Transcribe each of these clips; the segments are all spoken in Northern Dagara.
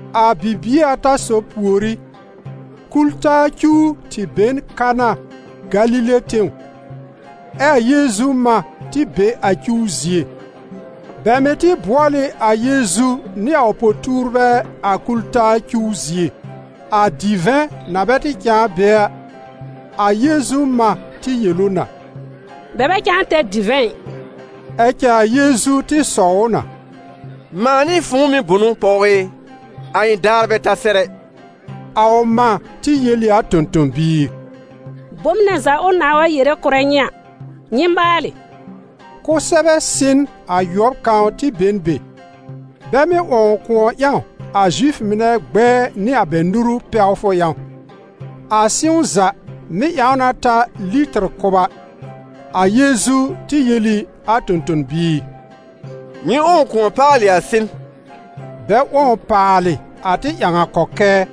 A bibie ata sob pùorí, kul-taa cuw tɩ be n Kana, Galile tẽw, ɛ a Yeezu mã tɩ be a cuw zie. Bɛ mɩ̀ tɩ bʋɔl ɩ a Yeezu nɩ a ʋ po-tuurbɛ a kul-taa cuw zie. A divɛ̃ na bɛ tɩ cãa be a, a Yeezu mã tɩ yel ʋ na: «Bɛ bɛ cãa tɛr divɛ̃ ɩ.» Ɛ cɛ a Yeezu tɩ sɔw ʋ na: «Mãa nɩ fʋ̃ʋ mɩ̀ bʋnʋ, pɔw ɩ? A ɩ̃ daar bɛ ta sɛr ɛ.» A ʋ mã tɩ yel ɩ a tõ-tõ-biir: «Bom nɛ za ʋ nãà wa yere kʋ̀rɛ nyɩ a, nyɩ maalɩ.» Kʋsɛbɛ sɩ̃n ayʋɔb kãw tɩ be n be, bɛ mɩ́ 'wɔ̃w kʋ̃ɔ ƴãw a Zifʋ mɩnɛ gbɛɛ nɩ a bɛ nuru pɛwfʋ ƴãw. A sɩ̃w za mɩ́ ƴãw na ta litɩr kʋba. A Yeezu tɩ yel ɩ a tõ-tõ-biir: «Nyɩ 'wɔ̃w kʋ̃ɔ paalɩ a sɩ̃n.» Bɛ 'wɔ̃w paalɩ a tɩ ƴãw a kɔkɛɛ.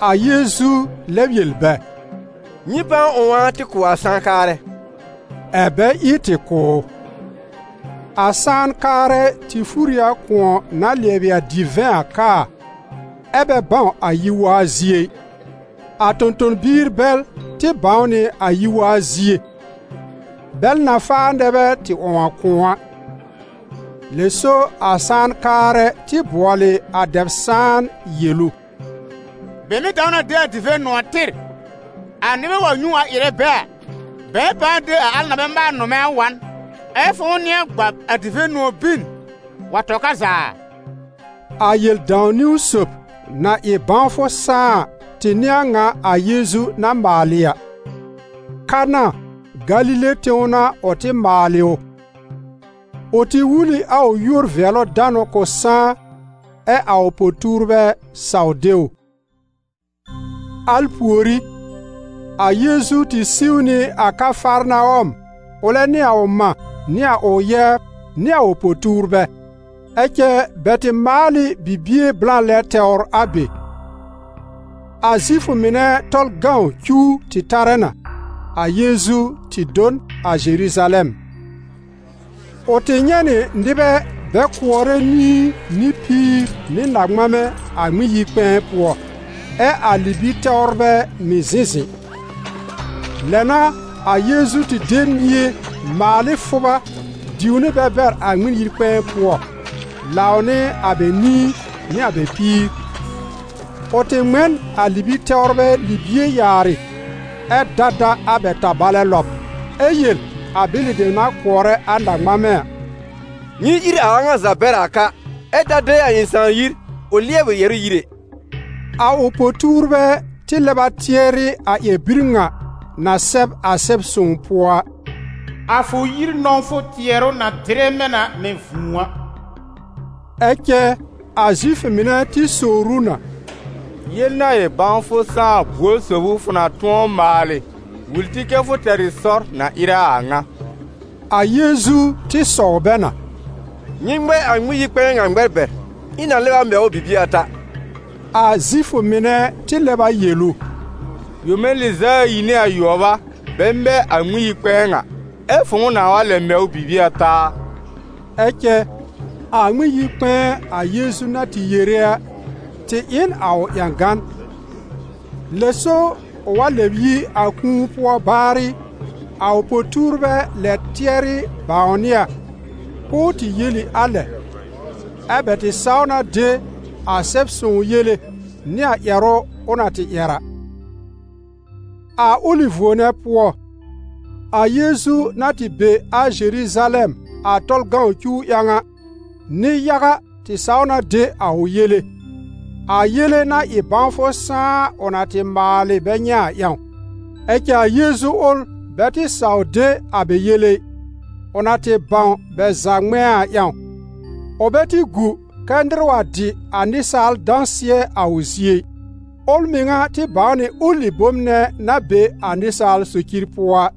A Yeezu lɛb yel bɛ: «Nyɩ pãa 'wɔ̃w a tɩ kʋ̀ a sãan-kaarɛ.» Ɛ̀ bɛ ɩ tɩ kʋ̀ ʋ. A sãan-kaarɛ tɩ fúr ɩ a kʋ̃ɔ na lɩɛbɩ a divɛ̃ a kaa a, ɛ bɛ bãw a yi-waa zie ɛ. A tõ-tõ-biir bɛl tɩ bãw nɩ a yi-waa zie, bɛl na faa nɛ bɛ tɩ 'wɔ̃w a kʋ̃ɔ a. Lɛ so a sãan-kaarɛ tɩ bʋɔlɩ a dɛb-sãan yel ʋ: «Bɛ mɩ́ dãw na de a divɛ̃-nʋ̃ɔ̀ tɩr, a nɩbɛ wa nyũ a ɩrɛ bɛ a, bɛ̃ɛ pãa de a al na bɛ maal nʋmɛ̃ a wa n, ɛ fʋ̃ʋ nɩ̃ɛ gbab a divɛ̃-nʋ̃ɔ̀ bin wa tɔ ka za a?» A Yel-dãw-niwn sob, na ɩ bãwfʋ sãá a, tɩ n'ɩ a ŋa a Yeezu na maalɩ a; Kana, Galile tẽw n'a ʋ tɩ maalɩ ʋ. Ʋ tɩ wul ɩ a ʋ yúor-vɩɛlʋ-danʋ k'ʋ sãá, ɛ a ʋ po-tuurbɛ saw de ʋ. Al pùorí, a Yeezu tɩ siw nɩ a Kafarnawɔm ʋlɛ nɩ a ʋ mã, nɩ a ʋ yɛbr, nɩ a ʋ po-tuurbɛ; ɛ cɛ bɛ tɩ maal ɩ bibie blã lɛ tɛwr a be. A Zifʋ mɩnɛ Tɔlʋ cuw tɩ tarɛ na. A Yeezu tɩ do n a Zeruzalɛm. Ʋ tɩ nyɛ̃ nɩ nɩbɛ bɛ kʋɔrɛ nĩi nɩ píir nɩ na-ŋmamɛ a Ŋmɩn-yi-kpɛ̃ɛ pʋɔ, ɛ a libi-tɛwrbɛ mɩ̀ zɩ̃ zɩ̃. Lɛ n'a, a Yeezu tɩ de mie maal ɩ fʋba diw nɩ bɛ bɛr a Ŋmɩn-yi-kpɛ̃ɛ pʋɔ, lãw nɩ a bɛ nĩi nɩ a bɛ píir; ʋ tɩ ŋmɛ n a libi-tɛwrbɛ libie yaarɩ, ɛ da da a bɛ tabalɛ lɔb, ɛ yel a bɛlɩ dem na kʋɔrɛ a na-ŋmamɛ a: «Nyɩ ír a a ŋa za bɛr a ka, ɛ ta de a ɩ̃ Sãà yir ʋ lɩɛbɩ yɛ̀rʋ́ yir ɛ!» A ʋ po-tuurbɛ tɩ lɛb a tɩɛrɩ a ƴɛr-bir ŋa na sɛb a Sɛb-sõw pʋɔ a: «A fʋ yir nɔ̃wfʋ tɩɛrʋ na dɩrɛ mɛ̃ na mɛ̃ vũu a.» Ɛ cɛ a Zifʋ mɩnɛ tɩ sowr ʋ na: «Yel-na-ɩ-bãwfʋ-sãá-a buor sob ʋ, fʋ na tʋ̃ɔ maalɩ wul tɩ kɛ fʋ tɛr ɩ sɔr na ɩrɛ a a ŋa?» A Yeezu tɩ sɔw bɛ na: «Nyɩ ŋmɛ a Ŋmɩn-yi-kpɛ̃ɛ ŋa ŋmɛr bɛr, ɛ ɩ̃ na lɛb a mɛ ʋ bibie ata.» A Zifʋ mɩnɛ tɩ lɛb a yel ʋ: «Yome lɩz'a ayi nɩ ayʋɔb a, bɛ mɛ a Ŋmɩn-yi-kpɛ̃ɛ ŋa, ɛ fʋ̃ʋ nãà wa lɛb mɛ ʋ bibie ata a?» Ɛ cɛ a Ŋmɩn-yi-kpɛ̃ɛ a Yeezu na tɩ yere a, tɩ ɩ n a ʋ ƴãgan. Lɛ so ʋ wa lɛb yi a kũu pʋɔ baarɩ, a ʋ po-tuurbɛ lɛb tɩɛrɩ bãwnɩ a, k'ʋʋ tɩ yel ɩ a lɛ, ɛ́ bɛ tɩ saw na de a Sɛb-sõw yele nɩ a ƴɛrʋ ʋ na tɩ ƴɛr a. A ʋlɩ vuo nɛ pʋɔ, a Yeezu na tɩ be a Zeruzalɛm a Tɔlʋ cuw ƴãw a, nɩ-yaga tɩ saw na de a ʋ yele, a yele-na-ɩ-bãwfʋ-sãá ʋ na tɩ maalɩ bɛ nyɛ̃ a ƴãw. Ɛ cɛ a Yeezu ʋl bɛ tɩ saw de a bɛ yele ɩ, ʋ na tɩ bãw bɛ za ŋmɛ̃a a ƴãw. Ʋ bɛ tɩ gu kɛ́ nɩr wa dɩ a nɩsaal dãsɩɛ a ʋ zie ɩ, ʋl mɩŋa tɩ bãw nɩ ʋlɩ bom nɛ na be a nɩsaal socir pʋɔ a.